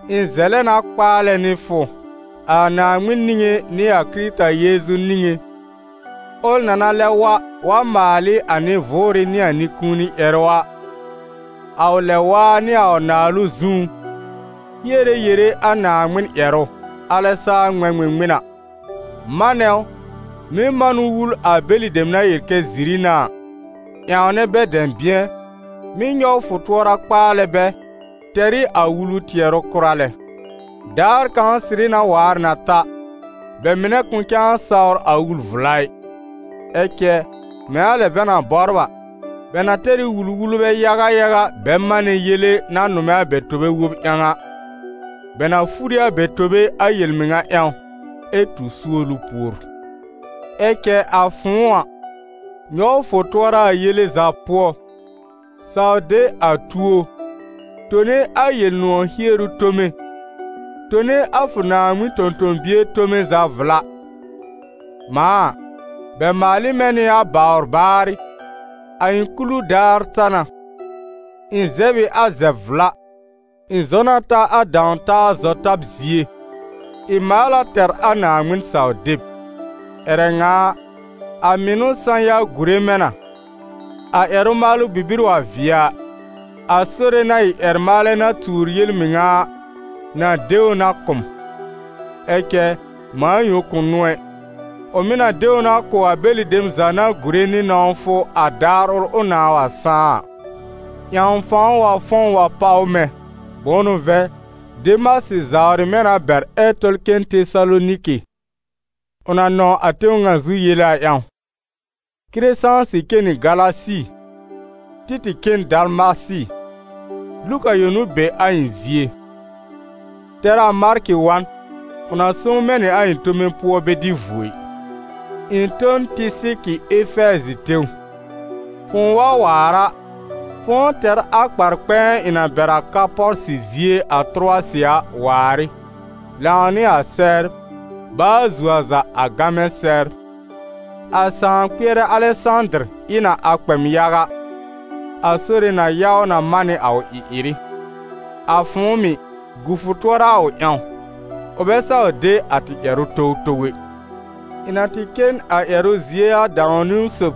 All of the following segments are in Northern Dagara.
Ɩ̃ zɛlɛ na kpaalɛ nɩ fʋ, a Naaŋmɩn niŋé nɩ a Kɩrɩta Yeezu niŋé, ʋl na na lɛb wa, wa maal ɩ a nɩ-vʋʋrɩ nɩ a nɩ-kũuni ƴɛrʋ a, a ʋ lɛb-waa nɩ a ʋ naalʋ zũú, hiere yere a Naaŋmɩn ƴɛrʋ, alɛ saa ŋmɛ̃ ŋmɩŋmɩn a, manɛ ʋ, mɩ́ man ʋ wul a bɛlɩ dem na yel kɛ ziri n'a a, ƴãwnɛ bɛ dɛ̃bɩ̃ɛ, mɩ́ nyɔw fʋ tʋɔra kpaalɛ bɛ, tɛr ɩ a wulu tɩɛrʋ kʋra lɛ. Daar kãw sɩrɩ na waar na ta, bɛ mɩnɛ kʋ̃ cãa sawr a wul-vla ɩ, ɛ cɛ mɛ̃ a lɛ bɛ na bɔbr a, bɛ na tɛr ɩ wul-wulbɛ yaga yaga bɛ manɛ yele na nʋmɛ a bɛ tobe wob ƴãw a. Bɛ na fur ɩ a bɛ tobe a yel-mɩŋa ƴãw, ɛ tu suolu pùor. Ɛ cɛ a fʋ̃ʋ a, nyɔw fʋ tʋɔra a yele za pʋɔ, saw de a tuo, tone a Yel-nʋ̃ɔ̀ hieru tome, tone a fʋ Naaŋmɩn tõ-tõ-bie tome za vla. Mãa a, bɛ maal ɩ mɛ̃ nɩ a bawr baarɩ, a ɩ̃ kulu daar ta na. Ɩ̃ zɛb ɩ a zɛb-vla, ɩ̃ zɔ na ta a dãw-taa zɔ-tab zie, ɩ̃ maal a tɛr a Naaŋmɩn saw-deb. Ƴɛrɛ ŋa a, a mɩnʋ sã-ya gùre mɛ̃ na; a ƴɛrʋ-maalʋ bibir wa vɩɛ a, a Sore na ɩ ƴɛr-maalɛ na tuur yel-mɩŋa a, na de ʋ na kʋ̀ m; ɛ cɛ mãa yõ kʋ̃ n'ʋ ɛ, ʋ mɩ̀ na de ʋ na kʋ̀ a bɛlɩ dem za na gùre nɩ nɔ̃wfʋ a daar ʋl ʋ nãà wa sãá a. Ƴãw fãw wa fɔ̃w wa páw mɛ̃. Bʋ̃ʋ n'ʋ vɛ̃, Demasɩ zawrɩ mɛ̃ na bɛr ɛ tɔl cen Tesaloniki, ʋ na nɔ̃w a tẽw ŋa zu yele a ƴãw. Kɩrɛsãsɩ cen nɩ Galasi, Títɩ̀ cen Dalmasɩ. Luka yõ n'ʋ be a ɩ̃ zie. Tɛr a Markɩ wa n, ʋ na sõw mɛ̃ nɩ a ɩ̃ tome pʋɔ bɛ dɩ vuo ɩ. Ɩ̃ tõ n Tɩsɩkɩ Efɛɛzɩ tẽw. Fʋ̃ʋ wa waar a, fʋ̃ʋ tɛr a kpar-kpɛ̃ɛ ɩ̃ na bɛr a Karpɔsɩ zie a Tʋrʋwasɩ a, waar ɩ, lãw nɩ a sɛbr, baa zuo a za a gamɛ sɛbr. A sãa-kpɩɛrɛ Alɛsãdɩr ɩ na a kpɛ m yaga. «A Sore na ya ʋ na man nɩ a ʋ ɩ-ɩrɩ.» A fʋ̃ʋ mɩ̀, gu fʋ tʋɔra a ʋ ƴãw. Ʋ bɛ saw de a tɩ ƴɛrʋ towtow ɛ. Ɩ̃ na tɩ cen a ƴɛrʋ zie a dãw-niwn sob,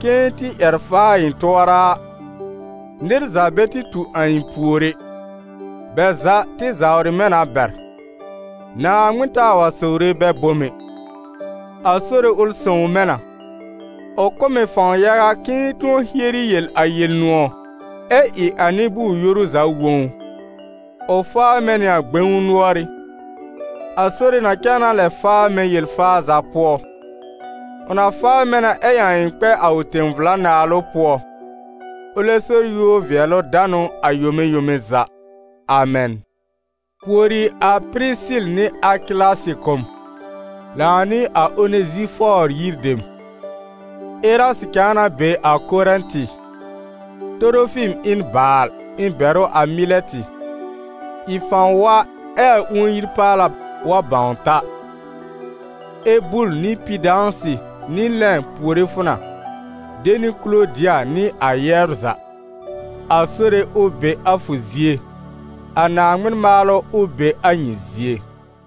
k'ɩ̃ɩ tɩ ƴɛr faa ɩ̃ tʋɔra a, nɩr za bɛ tɩ tu a ɩ̃ pùor ɛ, bɛ za tɩ zawrɩ mɛ̃ na bɛr. Naaŋmɩn taa wa sowre bɛ bom ɛ. A Sore ʋl sõw mɛ̃ na. Ʋ kʋ̀ m ɩ fãw yaga k'ɩ̃ɩ tʋ̃ɔ hieri yel a Yel-nʋ̃ɔ̀, ɛ ɩ a nɩ-bʋʋr-yoru za wõ ʋ. Ʋ faa mɛ̃ nɩ a gbẽw nʋɔrɩ́. A Sore na cãa na lɛ faa mɛ̃ yel-faa za pʋɔ. Ʋ na faa mɛ̃ na ɛ ƴãw ɩ̃ kpɛ a ʋ tẽ-vla Naalʋ pʋɔ. Ʋlɛ so yúor-vɩɛlʋ-danʋ a yome yome za. Amɛn. Puori a Pɩrɩsɩl nɩ Akɩlasɩ kʋ̀ m, lãw nɩ a Onezifɔɔr yir dem. Erasɩ cãa na be a Korɛ̃tɩ. Torofim ɩ n baal, ɩ̃ bɛr ʋ a Mɩlɛtɩ. Ɩ fãw wa ɛ a ũon-yi-paala wa bãw ta. Ebul nɩ Pidãsɩ nɩ Lɛ̃ puore fʋ na, de nɩ Kulodɩa nɩ a yɛbr za. A Sore ʋ be a fʋ zie. A Naaŋmɩn maalʋ, ʋ be a nyɩ zie.